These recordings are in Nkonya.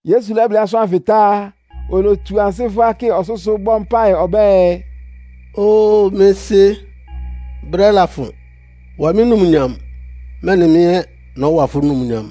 Yesu lɛ́blɩ́ asʋ́n ánfɩ tá, olotsu ansɩ́ fʋ́á kɩ ɔsʋ́sʋ́ bɔ́ mpáɩ ɔbɛ́ɛ, “Óo mɩ́ Sɩ́, brɛ́ lafʋn. Wa mɩ́ numnyam, mɛ́nɩ mɩ́ ɛ́ nɔ́wa fʋ́ numnyam.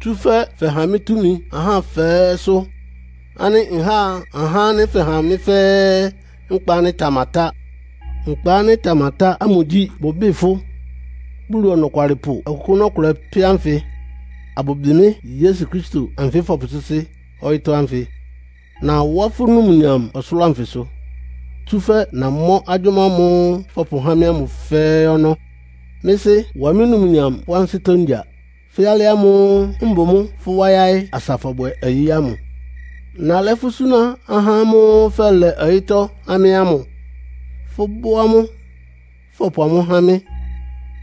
Tsúfɛ́ fɛha mɩ́ túmi ahá fɛ́ɛ́sʋ́, ánɩ́ nháa ahá ánɩ́ fɛha mɩ́ fɛ́ɛ́ nkpa ánɩ́ ɩtamatá. Nkpa ánɩ́ ɩtamatá ámʋ gyí, bʋbɩ́ɩ fʋ́ Bulu Ɔnɔkwalɩpʋ ɔkʋkʋ́nʋ́ ɔkʋlɛ pɛ́ ánfɩ, abʋbɩ mɩ́ Yesu Kristo anfɩ fɔpʋsɩ́sɩ́ ɔyɩ́tɔ́ ánfɩ. Nawá fʋ́ numnyam ɔsʋlʋ́ʋ anfɩsʋ, tsúfɛ́ namɔ́ agyʋ́má ámʋ́ʋ́ fɔpʋhá mɩ́ ámʋ fɛ́ɛ́ ɔnɔ́. Mɩ́ Sɩ́! Wa mɩ́ numnyam fʋ́ ansɩ́tɔ́ ngya, fɛ́ alɩ ámʋ́ʋ́ mbʋ mʋ́ fʋ́ wá yáɩ́ asa fɔbwɛ ɔyɩ́ ámʋ. “Nalɛ́ fʋ́ súná ahá ámʋ́ʋ́ fɛlɛ ɔyɩ́tɔ́ há mɩ́ ámʋ. Fʋ́bʋ́ amʋ́, fɔpʋ amʋ́ há mɩ́,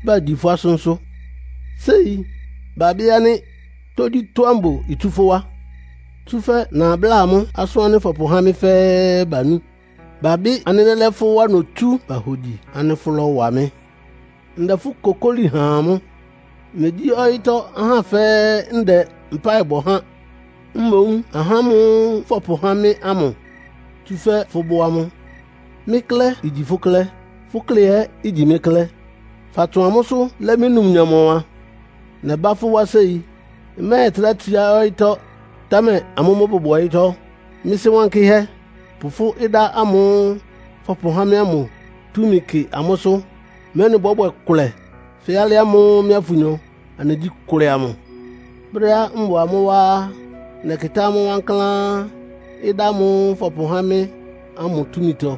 bagyi fʋ́ asʋ́nsʋ́. Séi babɩ́ ánɩ́ tógyítɔ́á mbʋ itsú fʋ́ wá. Tsúfɛ́ nabláa amʋ́ asʋ́n ánɩ́ fɔpʋhá mɩ́ fɛ́ɛ́, banú. Babɩ́ ánɩ́ lɛ́lɛ́ fʋ́ wá notsú, bahogyi ánɩ́ fʋ́lɔ́wa mɩ́. “Ndɛ fʋ́ kokóli ha amʋ́. Megyí ɔyɩ́tɔ́ ahá fɛ́ɛ́ ndɛ mpáɩ bɔ há. Mboún ahá ámʋ́ʋ́ fɔpʋhá mɩ́ ámʋ, tsúfɛ́ fʋ́bʋ́ amʋ́. Mɩ́ klɛ́ igyi fʋ́ klɛ́, fʋ́ klɛ́ ɛ́ igyi mɩ́ klɛ́. Fatsʋn amʋ́sʋ́ lɛ́ mɩ́ numnyam ɔwan. Nɛbá fʋ́ wá séi. Mmɛ́ɛtrá tsiá ɔyɩ́tɔ́, támɛ amʋ́ mʋ́ bʋbʋ ɔyɩ́tɔ́. Mɩ́ Sɩ́ Wankɩ́hɛ́, pʋ fʋ́ ɩdá ámʋ́ʋ́ fɔpʋhá mɩ́ ámʋ túmi kɩ amʋ́sʋ́, mɛ́nɩ bɔ́bwɛ kʋlɛ fɛ́ alɩ ámʋ́ʋ́ mɩ́a fʋnyɔ anɩgyí kʋlɛ amʋ. Brɛ́á mbʋ amʋ́ wá á, nɛkɩtá amʋ́ wankláán, ɩdá ámʋ́ʋ́ fɔpʋhá mɩ́ ámʋ túmitɔ.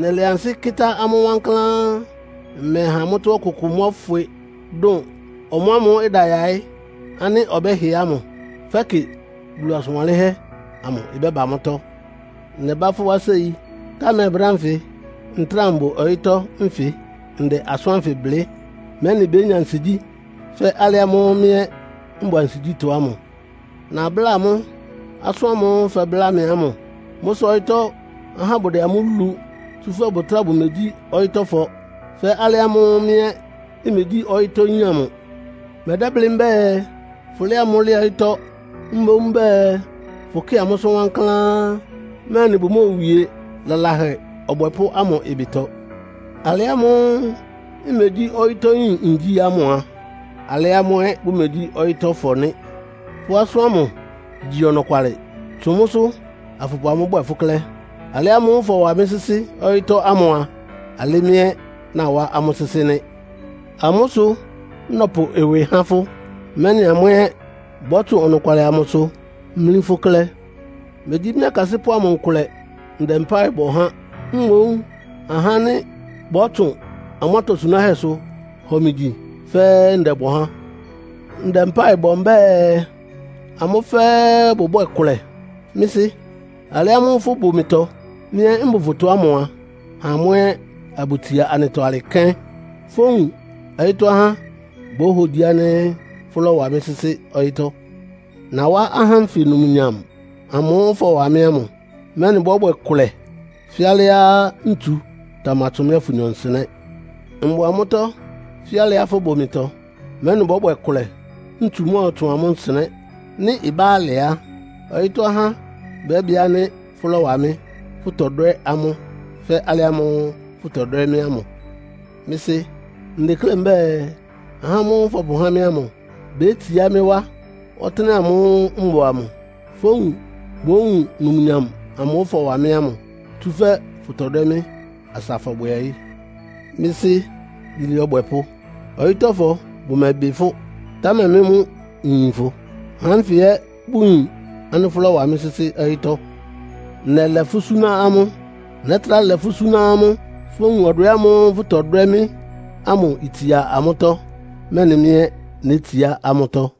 Nɛlɛ ansɩ́ kɩ́tá amʋ́ wankláán. Mmɛha amʋ́tɔ́ ɔkʋkʋ mɔ́fwɩ, dʋn ɔmʋamʋ́ʋ́ ɩda yaɩ́ ánɩ́ ɔbɛ́hɩ ámʋ, fɛ́kɩ Bulu asʋn wanlɩ́nhɛ́ amʋ ɩbɛ́ba mʋ́tɔ́. Nɛbá fʋ́ wá séi. Támɛ brɛ́ ánfɩ ntráa mbʋ ɔyɩ́tɔ́ nfɩ ndɛ asʋ́n ánfɩ blɩ́, mɛ́nɩ bénya ansigyí fɛ́ alɩ ámʋ́ʋ́ mɩ́ ɛ́ mbʋ ansigyítɔ́ amʋ. Nabláa amʋ́ asʋ́n ámʋ́ʋ́ fɛbláa mɩ ámʋ. Mʋ́ sʋ ɔyɩ́tɔ́ ahá bʋdɛ amʋ́ lu, tsúfɛ́ bʋtráa bʋmegyí ɔyɩ́tɔ́fɔ, fɛ́ alɩ ámʋ́ʋ́ mɩ́ ɛ́ mmegyí ɔyɩ́tɔ́yín amʋ. Mmɛdɛ́blɩ́ mbɛ́ɛ, fʋlɛ́ɛ amʋ́ lɛ ɔyɩ́tɔ́. Mboún mbɛ́ɛ fʋkɩ́ɩ amʋ́sʋ́ wankláán, mɛ́nɩ bʋmóowie lalahɛ ɔbwɛpʋ́ ámʋ ɩbɩtɔ. Alɩ ámʋ́ʋ́ mmegyí ɔyɩ́tɔ́yín ngyi ámʋ a, alɩ́ amʋ́ ɛ́ bʋmegyí ɔyɩ́tɔ́fɔ nɩ́. Fʋ́ asʋ́n ámʋ gyí ɔnɔkwalɩ. Tsʋn mʋ́sʋ́ afʋpʋ amʋ́ bwɛ fʋ́ klɛ́. Alɩ ámʋ́ʋ́ fɔwa mɩ́ sɩ́sɩ́ ɔyɩ́tɔ́ ámʋ a, alɩ́ mɩ́ ɛ́ nawá amʋ́ sɩ́sɩ́ nɩ́. Amʋ́ sʋ nɔpʋ ɩwɩ há fʋ́, mɛ́nɩ amʋ́ ɛ́ bɔ́tsʋn ɔnɔkwalɩ amʋsʋ mlí fʋ́ klɛ́. “Megyí mɩ́ akasɩ́pʋ́ amʋ nkʋlɛ ndɛ mpáɩ bɔ há. Mboún ahá ánɩ́ bɔ́tsʋn amʋ́ atosunáhɛ́sʋ hɔ mɩ gyi fɛ́ɛ́ ndɛbɔ há. Ndɛ mpáɩ bɔ mbɛ́ɛ, amʋ́ fɛ́ɛ́ bʋbwɛ́ɛ kʋlɛ. Mɩ́ Sɩ́, alɩ ámʋ́ʋ́ fʋbʋ mɩtɔ, mɩ́ ɛ́ mbʋ fʋtɔ ámʋ a, ha amʋ́ ɛ́ abʋtsia anɩtɔ alɩ kɛ́n, fówun ɔyɩ́tɔ́ ahá bóhogyi ánɩ́ fʋ́lɔ́wa mɩ́ sɩ́sɩ́ ɔyɩ́tɔ́. Nawá ahá ánfɩ numnyam amʋ́ʋ́ fɔwa mɩ́ ámʋ, mɛ́nɩ bɔ́bwɛ kʋlɛ fɛ́ alɩá ntsu tamatsʋn mɩ́á fʋnyɔ nsɩnɛ́. Mbʋ amʋ́tɔ́ fɛ́ alɩá fʋbʋ mɩtɔ, mɛ́nɩ bɔ́bwɛ kʋlɛ, ntsu mɔ́ɔtsʋn amʋ́ nsɩnɛ́. Nɩ́ ɩbá alɩ á, ɔyɩ́tɔ́ ahá bɛ́bɩ ánɩ́ fʋ́lɔ́wa mɩ́, fʋtɔdwɛ́ amʋ́ fɛ́ alɩ ámʋ́ʋ́ fʋtɔdwɛ́ mɩ́ ámʋ. “Mɩ́ Sɩ́! Ndeklé mbɛ́ɛ ahá ámʋ́ʋ́ fɔpʋhá mɩ́ ámʋ bétsiá mɩ́ wá ɔtɩ́nɛ́ ámʋ́ʋ́ mbʋ amʋ. Fówun bówun numnyam amʋ́ʋ́ fɔwa mɩ́ ámʋ. Tsúfɛ́ fʋtɔdwɛ́ mɩ́ asa fɔbwɛ ɔyɩ́. Mɩ́ Sɩ́ Yilé ɔbwɛpʋ́! Ɔyɩ́tɔ́fɔ bʋmɛbɩ fʋ́, támɛ mɩ́ mʋ nyin fʋ. Ahá ánfɩ ɛ́ bʋyin ánɩ́ fʋ́lɔ́wa mɩ́ sɩ́sɩ́ ɔyɩ́tɔ́. Nɛlɛ fʋ́ súná amʋ́. Nɛ́trá lɛ fʋ́ súná amʋ́. Fówun ɔdwɛ ámʋ́ʋ́ fʋtɔdwɛ́ mɩ́ ámʋ itsia amʋ́tɔ́, mɛ́nɩ mɩ́ ɛ́ nétsiá amʋ́tɔ́.”